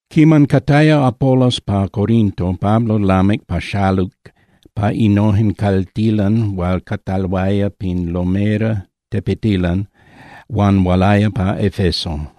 Quiman cataya Apolos pa Corinto, Pablo lamic paxaluc pa innojen caltilan hual cataloaya pin lomera (tepetilan) huan hualaya pa Efeso.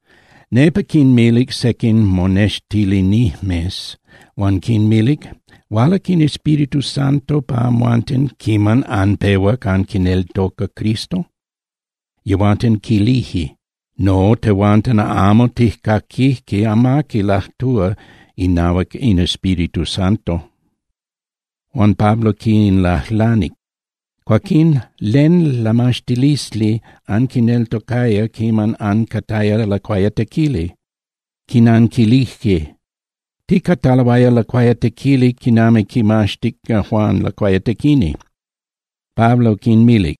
Nepa quinmitac sequin monextilinijmes huan quinmilic: —¿Hualac in Espíritu Santo pa amhuanten quiman anpehuac anquineltocac Cristo? Yehuanten quilije: —No, tehuanten amo tijcaquijque amaqui lajtúa inahuac in Espíritu Santo. Huan Pablo quinlajlanic: —Cuaquín ¿len lamaxtilisli anquineltocaya quiman ancataya lacuayatequili? Quinanquilijque: —Ticataloaya lacuayatequili quinami quimaxtic Juan Lacuayatequini. Pablo quinmilic: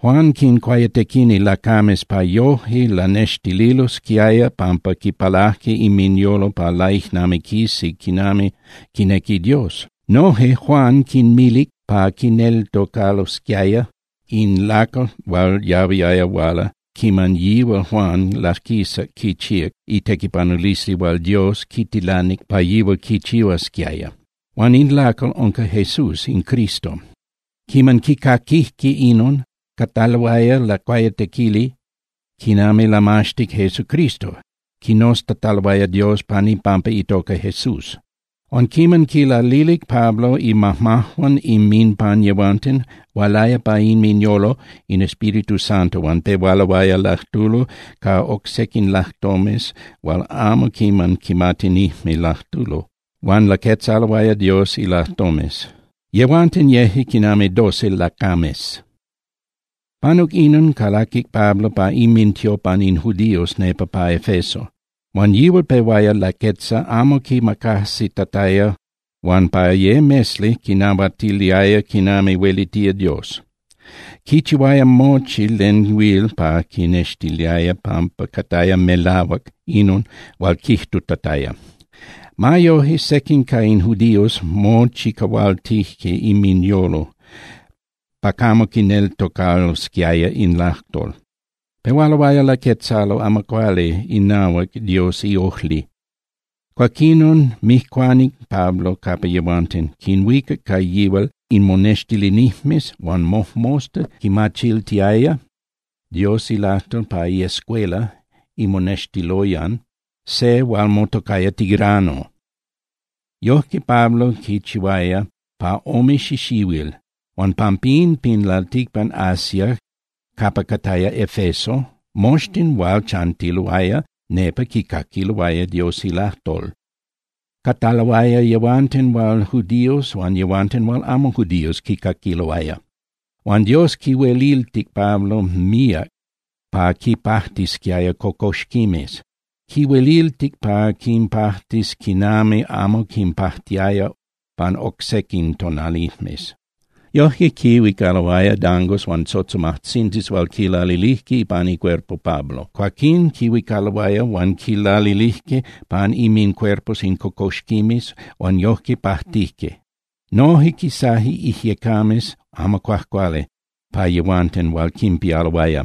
—Juan quincuayatequini lacames pa yoje lanextililosquiaya pampa quipalaje inminyolo pa laijnamiquisi quinami quinequi Dios. Noje Juan quinmilic pa quineltocalosquiaya in lacal hual yahuiaya huala quiman yihual Juan laquisac quichíac itequipanulisli hual Dios quitilanic pa yihual quichihuasquiaya. Huan in lacal unca Jesús in Cristo. Quiman quicaquijque inon, cataloaya lacuayatequili quinami lamaxtic Jesucristo, quinoztataloaya Dios pan ipampa itoca Jesús. Huan quiman quinlalilic Pablo imajmajuan inminpan yehuanten, hualaya pa inminyolo in Espíritu Santo huan pehualoaya lajtulo ca oc sequin lajtomes hual amo quiman quimatinijme lajtulo, huan laquetzaloaya Dios ilajtomes. Yehuanten yeje quinami doce lacames. Panuc inon, calaquic Pablo pa inmintiopan in judíos nepa pa Efeso, huan yihual pehuaya laquetza amo quimacajsitataya huan pa ye mesli quinnahuatiliaya quinami huelitía Dios. Quichihuaya mochi len huil pa quinnextiliaya pampa cataya melahuac inon hual quijtutataya. Ma yoje, sequin ca in judíos mochicahualtije inminyolo pa camo quineltocalosquiaya in lajtol. Pehualoaya laquetzalo amo cuali inahuac Dios iojli. Cuaquinon mijcuanic Pablo capa yehuanten, quinhuicac ca yihual in monextilinijmes huan mojmosta quinmachiltiaya Dios ilajtol pa iescuela (imonextiloyan) se hual motocaya Tirano. Yojque Pablo quichihuaya pa ome xixihuil, huan pampín, pin lalticpan Asia capa cataya Efeso, moxtin hual chantiloaya nepa quicaquiloaya Dios ilajtol. Cataloaya yehuanten hual judíos huan yehuanten hual amo judíos quicaquiloaya. Huan Dios quihueliltic Pablo míac pa quinpajtisquiaya cocoxquimes. Quihueliltic pa quinpajtis quinami amo quinpajtiaya pan oc sequin tonalijmes. Yojque quihuicaloaya dangos huan tzotzomajtzindis hual quilalilijque pan icuerpo Pablo, cuaquín quinhuicaloaya huan quinlalilijque pan inmincuerpos in cocoxquimes huan yojque pajtijque. Noje quisaje ijyecames amo cuajcuali pa yehuanten hual quinpialoaya.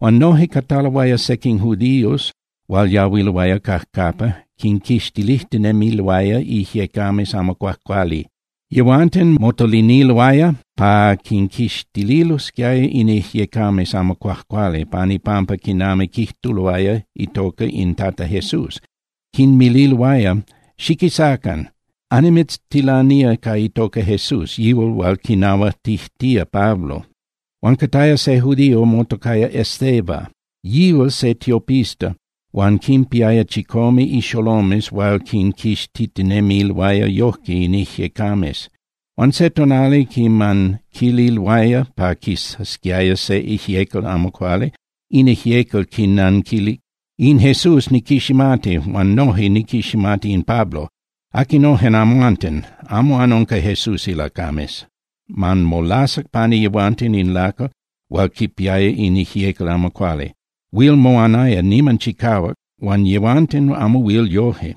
Huan noje cataloaya sequin judíos hual yahuiloaya cajcapa, quinquixtilijtinemiloaya ijyecames amo cuajcuali. Yehuanten motoliniloaya pa quinquixtililosquiaya in ijyecames amo cuajcuali pan ipampa quinami quijtuloaya itoca in Tata Jesús, quinmililoaya: —Xiquisacan, annimitztilanía ca itoca Jesús, yihual hual quinahuatijtía Pablo. Huan cataya se judío motocaya Esceva, yihual se tiopista huan quinpiaya chicome ixolomes hual quinquixtitinemiloaya yojque in ijyecames. Huan se tonali quiman quililoaya pa quisasquiaya se ijyecal amo cuali, in ijyecal quinnanquilic: —In Jesús niquiximati huan noje niquiximati in Pablo. ¿Aquinojen amhuanten? Amo anunca Jesús ilacames. Huan molasac pani yehuanten in lacal hual quipiaya in ijyecal amo cuali. Huil moanaya niman chicahuac huan yehuanten amo huil yoje,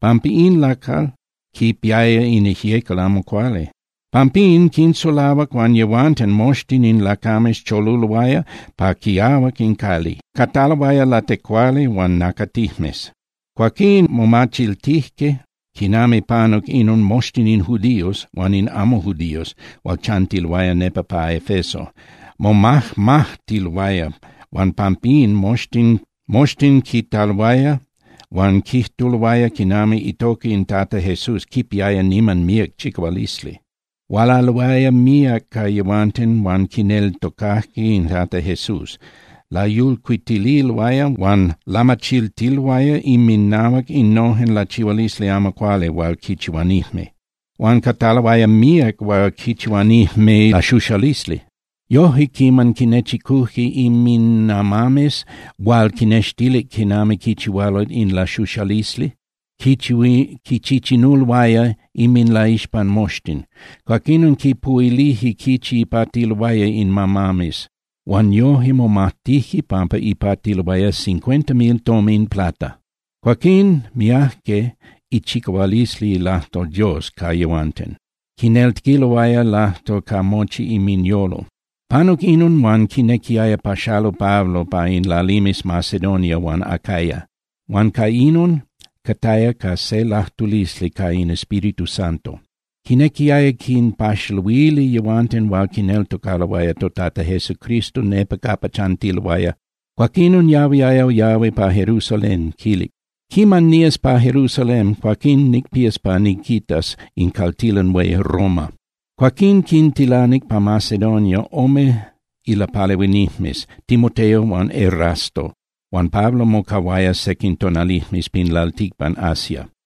pampa in lacal quipiaya in ijyecal amo cuali. Pampín quinsulahuac huan yehuanten moxtin in lacames choluloaya pa quiahuac in cali, cataloaya latecuali huan nacatijmes. Cuaquín momachiltijque quinami panuc inon moxtin in judíos huan in amo judíos hual chantiloaya nepa pa Efeso, momajmajtiloaya huan pampín moxtin quitaloaya huan quijtuloaya quinami itoca in Tata Jesús quipiaya niman míac chicahualisli. Hualaloaya míac ca yehuanten hual quineltocajque in Tata Jesús, layulcuitiloaya huan lamachiltiloaya inminahuac innojen lachihualisli amo cuali hual quichihuanijme. Huan cataloaya míac hual quichihuanijme laxuxalisli. Yojque quiman quinechicujque inminamames hual quinextilic quinami quichihualo in laxuxalisli, quinchichinuloaya inminlaixpan moxtin. Cuaquinon quipuhuilijque quichi ipatiloaya in amames, huan yoje momatijque pampa ipatiloaya cincuenta mil tomin plata. Cuaquín miajque ichicahualisli ilajtol Dios ca yehuanten, quineltocaloaya ilajtol ca mochi inminyolo. Panuc inon huan quinequiaya paxalu Pablo pa in lalimes Macedonia huan Acaya huan ca inon cataya ca se lajtulisli ca in Espíritu Santo. Quinequiaya quinpaxaluili yehuanten hual quineltocaloaya toTata Jesucristo nepa cajcapa chantiloaya. Cuaquinon yahuiaya yahui pa Jerusalén, quilic: —Quiman nías pa Jerusalén, cuaquín nicpías pa niquitas in caltilan hué Roma. Cuaquín quintilanic pa Macedonia ome ilapalehuinijmes, Timoteo huan Erasto, huan Pablo mocahuaya sequin tonalijmes pin lalticpan Asia.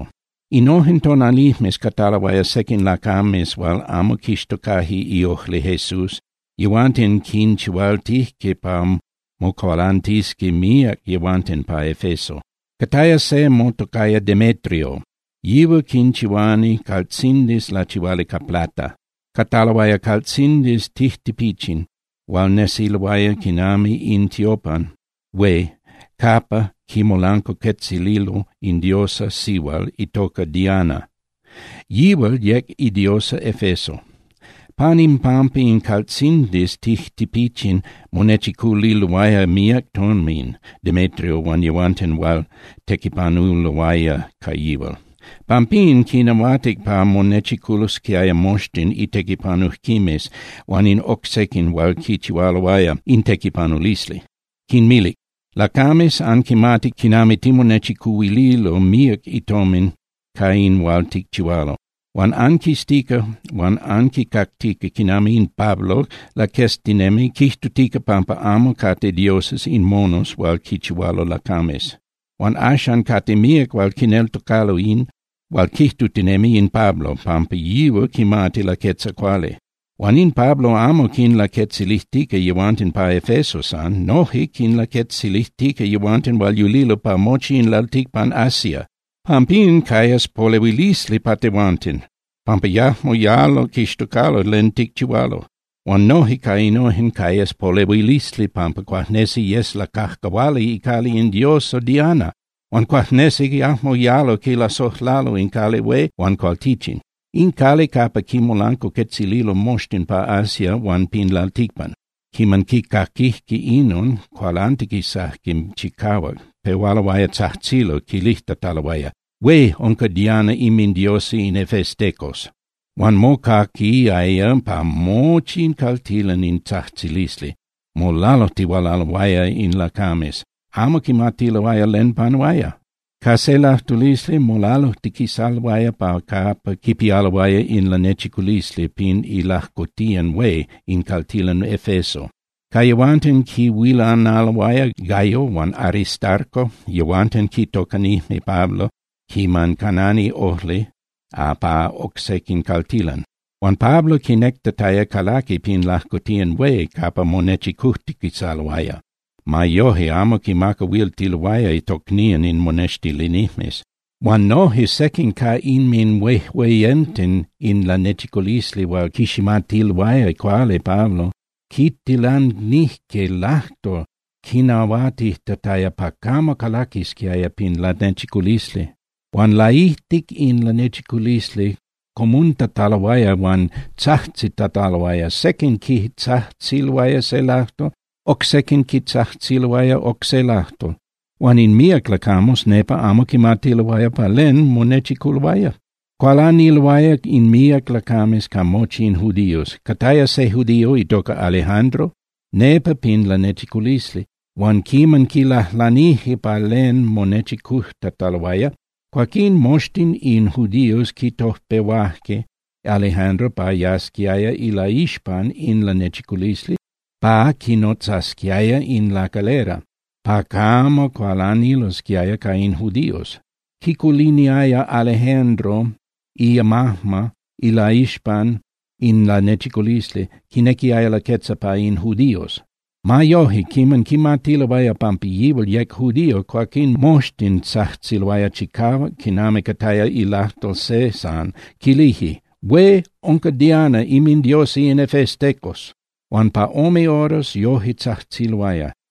Innojen tonalijmes cataloaya sequin lacames hual amo quixtocaje iojli Jesús, yehuanten quinchihualtijque pa mocualantisqui míac yehuanten pa Efeso. Cataya se motocaya Demetrio, yihual quinchihuani caltzindis lachihuali ca plata. Cataloaya caltzindis tijtipichin hual nesiloaya quinami in tiopan hué capa quimolancuacuetzililo in diosa sihual itoca Diana, yihual yec idiosa Efeso. Pan impampa in caltzindis tijtipichin monechiculiloaya míac tomin Demetrio huan yehuanten hual tequipanuloaya ca yihual. Pampín quinahuatic pa monechiculosquiaya moxtin itequipanujquimes huan in oc sequin hual quichihualoaya in tequipanulisli, quinmilic: —Lacames, anquimati quinami timonechicuhuililo míac tomin ca in hual ticchihualo. Huan anquiztica huan anquicactica quinami in Pablo laqueztinemi quijtutica pampa amo cate dioses in monos hual quichihualo lacames. Huan axan cate míac hual quineltocalo in hual quijtutinemi in Pablo pampa yihual quimati laquetza cuali. Huan in Pablo amo quinlaquetzilijtica yehuanten pa Efeso san. Noje quinlaquetzilijtica yehuanten hual yulilo pa mochi in lalticpan Asia. Pampín cayas polehuilisli pa tehuanten, pampa yajmo yalo quixtocalo len ticchihualo. Huan noje ca inon cayas polehuilisli pampa cuajnesi yes lacajcahuali icali in diosa Diana. Huan cuajnesi yajmo yalo quilasojlalo in cali hué huan cualtichin, in cali capa quimolancuacuetzililo moxtin pa Asia huan pin lalticpan. Quiman quicaquijque inon, cualantiquisajque chicahuac, pehualoaya tzajtzilo, quilijtataloaya: —¡Hué unca Diana inmindiosa in efestecos! Huan mocaquiaya pa mochi in caltilan in tzajtzilisli, molalujtihualaloaya in lacames, amo quimatiloaya len panuaya. Ca se lajtulisli molalujtiquisaloaya pa capa quipialoaya in lanechiculisli pin ilajcotiyan hué in caltilan Efeso. Ca yehuanten quihuilanaloaya Gayo huan Aristarco, yehuanten quitocanijme Pablo quiman canani ojli pa oc sequin caltilan. Huan Pablo quinectataya calaqui pin lajcotiyan hué capa monechicujtiquisaloaya. Ma yoje, amo quimacahuiltiloaya tocnían in monextilinijmes. Huan noje sequin ca inminhueyenten in lanechiculisli hual quiximatiloaya cuali Pablo quitilanijque lajtol quinahuatijtataya pa camo calaquisquiaya pin lanechiculisli. Huan laijtic pin lanechiculisli comuntataloaya huan tzajtzitataloaya. Sequin quitzajtziloaya se lajtol, oc sequin quitzajtziloaya oc se lajtol. Huan in míac lacames nepa amo quimatiloaya pa len monechiculoaya. Cualaniloaya in míac lacames ca mochi in judíos. Cataya se judío itoca Alejandro nepa pin lanechiculisli, huan quiman quilajlanijque pa len monechicujtataloaya, cuaquín moxtin in judíos quitojpehuaje Alejandro pa yasquiaya ilaixpan in lanechiculisli pa quinnotzasquiaya in lacalera pa camo cualanilosquiaya ca in judíos. Quiculiniaya Alejandro imajma ilaixpan in lanechiculisli, quinequiaya laquetza pa in judíos. Ma yoje, quiman quimatiloaya pampa yihual yec judío, cuaquín moxtin tzajtziloaya chicahuac quinami cataya ilajtol se san, quilije: —¡Hué unca Diana inmindiosa in efestecos! Huan pa ome horas yoje tzajtziloaya.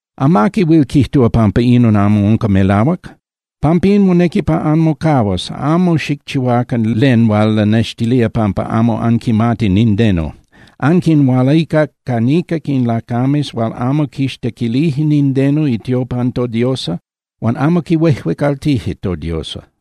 Amaqui huil quijtúa pampa inon amo unca melahuac. Pampín monequi pa anmocahuas, amo xicchihuacan len hual lanextilía pampa amo anquimati nindeno. Anquinhualicac ca niquic in lacames hual amo quixtequilije nindeno itiopan todiosa huan amo quihuejuecaltije todiosa.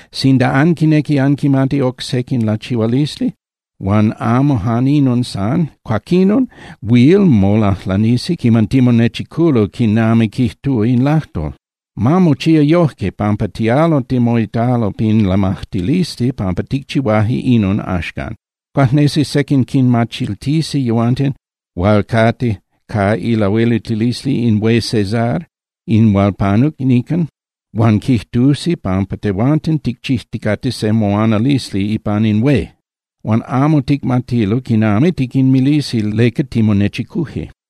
Sinda anquinequi anquimati oc sequin lachihualisli huan amo jan inon san, cuaquinon huil molajlanisi quiman timonechiculo quinami quijtúa in lajtol. Ma mochía yojque, pampa tialo timoitalo pin lamajtilisli pampa ticchihuaje inon axcan. Cuajnesi sequin quinmachiltisi yehuanten hual cate ca ilahueliltilisli in hué Cesar in hual panuc nican huan quijtusi pampa tehuanten ticchijticate se moanalisli ipan in hué. Huan amo ticmatilo quinami tiquinmilisi leca timonechicuje.